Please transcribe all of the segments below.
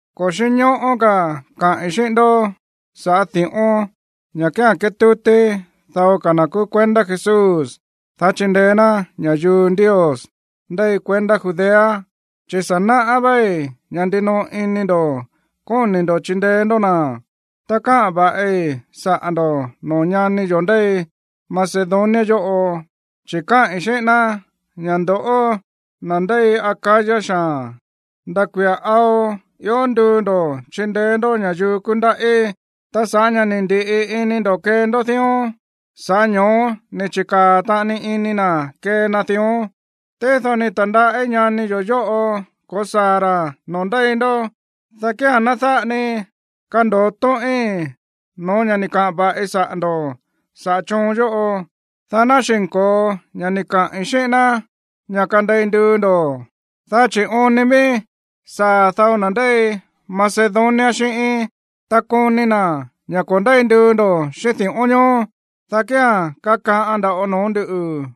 Ko̱ xínñóꞌó ka̱ kaꞌi̱n xíꞌín ndoꞌó sa̱ꞌá di̱ꞌón, ña̱ kía̱n kétútí dao ka̱ na̱ kúú kuendá Jesús, dá chindeé ná ña̱yuu Ndios ndéi kuendá Judea, chi̱ sa̱ naꞌá váí ña̱ ndinoꞌo ini ndo̱ kóni̱ ndo̱ chindeé ndó na̱. Ta káꞌa̱n va̱ꞌi saꞌa̱ ndo̱ꞌó noo̱ ñani yo̱ ndéi Macedonia yóꞌo, chi̱ káꞌi̱n xíꞌín ná ña̱ ndoꞌó, na̱ ndéi Acaya xaa̱n, nda̱ kuia̱ ao ió nduu ndo̱ chindeé ndó ña̱yuu kúndaꞌí. Ta sa̱ꞌá ña̱ ni̱ ndi̱ꞌi ini ndo̱ kee ndó dión, sa̱ꞌá ño̱ó ni̱ chi̱kaa̱ taꞌani ini na̱ kee na dión. Tído ni̱ ta̱ndaꞌí ñani yo̱ yóꞌo ko̱saa̱ ra̱ noo̱ ndéi ndó, dá kía̱n ná dáꞌa ni kando̱o tóꞌín no̱ó ña̱ ni̱ kaꞌa̱n va̱ꞌi saꞌa̱ ndo̱ saꞌa̱ choon yóꞌo, dá ná xi̱nko̱o ña̱ ni̱ kaꞌi̱n xíꞌín ná ña̱ kandei nduu ndo̱. Dá chi̱ oon ni ví saa̱ dao na̱ ndéi Macedonia xíꞌíín, ta koni na̱ ña̱ ko̱ ndéi nduu ndo̱ xíꞌín di̱ꞌón ñoó, dá kía̱n kakaꞌan nda̱ꞌo noo̱ ndúꞌu̱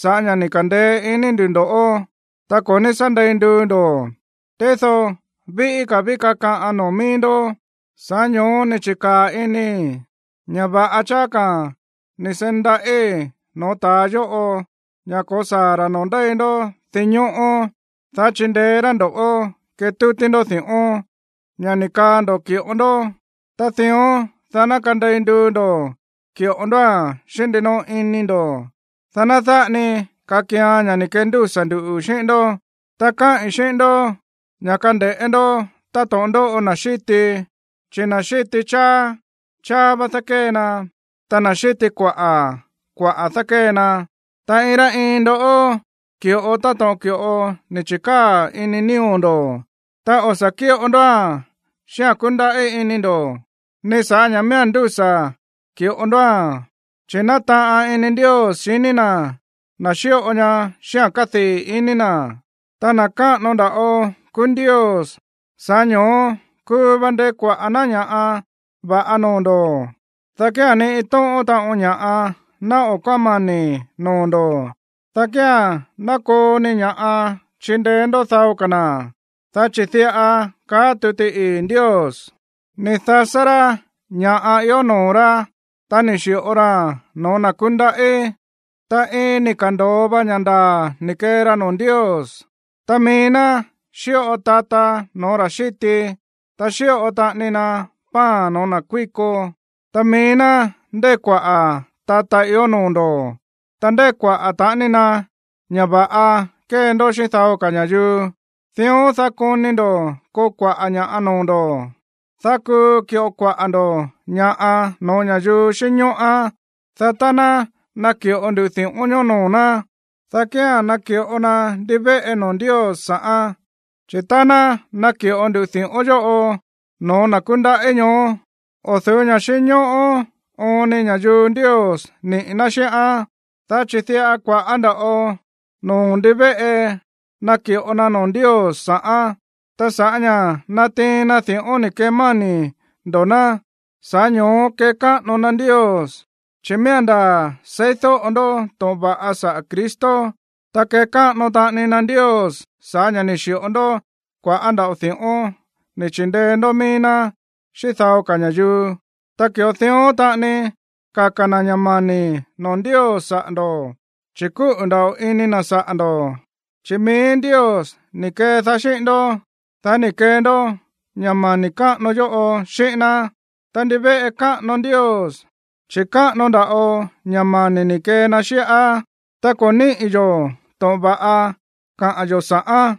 sa̱ꞌá ña̱ ni̱ ka̱ndeé iní ndu̱ ndo̱ꞌó, ta ko̱ ní sá ndei nduu ndo̱. Tído víꞌí ka̱ ví kakaꞌan noo̱ mií ndó. Sa̱ꞌá ño̱ó ni̱ chi̱kaa̱ inii̱ ña̱ va̱ꞌa cháá ka̱ ni̱ seí ndaꞌí no̱ó ta̱a yóꞌo ña̱ ko̱saa̱ ra̱ noo̱ ndéi ndó dinñóꞌó, dá chindeé rá ndo̱ꞌó ketútí ndó di̱ꞌón, ña̱ ni̱ kaa ndo̱ ki̱ꞌo ndó. Ta dión, dá ná kandei nduu ndo̱ ki̱ꞌo ndóa̱n xíꞌín ndinoꞌo ini ndo̱, dá ná dáꞌa ni kakian ña̱ ni̱ kendúsa̱ ndu̱ xíꞌín ndó. Ta káꞌi̱n xíꞌín ndó ña̱ kande̱ꞌé ndó táto̱ꞌon ndóꞌo na̱ xíti, chi̱ na̱ xíti cháá, cháá vá dákée na. Ta na̱ xíti kuaꞌa̱, kuaꞌa̱ dákée na. Ta iin rá iin ndó ki̱ꞌo táto̱ꞌon ki̱ꞌo ni̱ chi̱kaa̱ ini nío̱ ndo̱. Ta o̱ sa̱ kíꞌo ndóa̱n xíꞌa̱n kúndaꞌí ini ndo̱, ni sa̱ꞌá ña̱ miía̱n ndúsa̱ ki̱ꞌo ndóa̱n. Chi̱ nátaꞌan ini Ndios xiní na̱ na̱ xíꞌo ña̱ xíꞌa̱n kádii̱ iní na̱. Ta na̱ káꞌano nda̱ꞌo kúú Ndios, sa̱ꞌá ño̱ó kuu va ndekuaꞌa̱ ná ña̱ꞌa va̱ꞌa noo̱ ndo̱, dá kía̱n ni iin tóꞌón taꞌon ña̱ꞌa ná o̱ kómani̱ noo̱ ndo̱, dá kía̱n ná koo ni ña̱ꞌa chindeé ndó dao ka̱ na̱. Dá chi̱ diꞌa kaá tuti ii̱ Ndios: Ni̱ dasá rá ña̱ ió noo̱ rá, ta ni̱ xi̱ꞌo raa̱n no̱ó na̱ kúndaꞌí, ta iin ni̱ ka̱ndo̱o va ña̱ ndaa̱ ni̱ kee ra noo̱ Ndios. Ta mií ná xíꞌo tata no̱ó ra̱ xíti, ta xíꞌo taꞌani na pan no̱ó na̱ kuíko, ta mií ná ndekuaꞌa̱ tata ió noo̱ ndo̱. Ta ndekuaꞌa̱ taꞌani na ña̱ va̱ꞌa kee ndó xíꞌín dao ka̱ ña̱yuu. Dión, dá koni ndo̱ koo kua̱ꞌá ña̱ꞌa noo̱ ndo̱, dá kuu ki̱ꞌo kuaꞌa̱ ndo̱ ña̱ꞌa no̱ó ña̱yuu xínñóꞌán. Dá tá ná naki̱ꞌo ndu di̱ꞌón ñoó noo̱ ná, dá kía̱n naki̱ꞌo na ndivéꞌe noo̱ Ndios sa̱ꞌán. Chi̱ tá ná naki̱ꞌo ndu di̱ꞌón yóꞌo no̱ó na̱ kúndaꞌí ñoó, o̱ du̱ú ña̱ꞌa xínñóꞌó oon ni ña̱yuu Ndios niꞌi̱ ná xíꞌán, dá chi̱ diꞌa kua̱ꞌá nda̱ꞌo noo̱ ndivéꞌe naki̱ꞌo na noo̱ Ndios sa̱ꞌán. Ta sa̱ꞌá ña̱ natiin na di̱ꞌón ni̱ kemáni̱ ndo̱ ná, sa̱ꞌá ño̱ó kekáꞌano na Ndios, chi̱ miía̱n ndaa̱ seídóꞌo ndó to̱ꞌon va̱ꞌa saꞌa̱ Cristo. Ta kekáꞌano taꞌani na Ndios sa̱ꞌá ña̱ ni̱ xi̱ꞌo ndó kua̱ꞌá nda̱ꞌo di̱ꞌón ni̱ chi̱ndeé ndó mií ná xíꞌín dao ka̱ ña̱yuu. Ta ki̱ꞌo dión taꞌani kaka̱ na̱ ña̱ mani̱ noo̱ Ndios saꞌa̱ ndo̱, chi̱ kúꞌu̱ nda̱ꞌo ini na̱ saꞌa̱ ndo̱, chi̱ mií Ndios ni̱ kedaá xíꞌín ndó, dá ni̱ kee ndó ña̱ mani̱ káꞌano yóꞌo xíꞌín ná. Ta ndivéꞌe káꞌano Ndios, chi̱ káꞌano nda̱ꞌo ña̱ mani̱ ni̱ kee na xíꞌá. Ta ko̱ níꞌi̱ yo̱ to̱ꞌon va̱ꞌa kaꞌa̱n yo̱ sa̱ꞌán.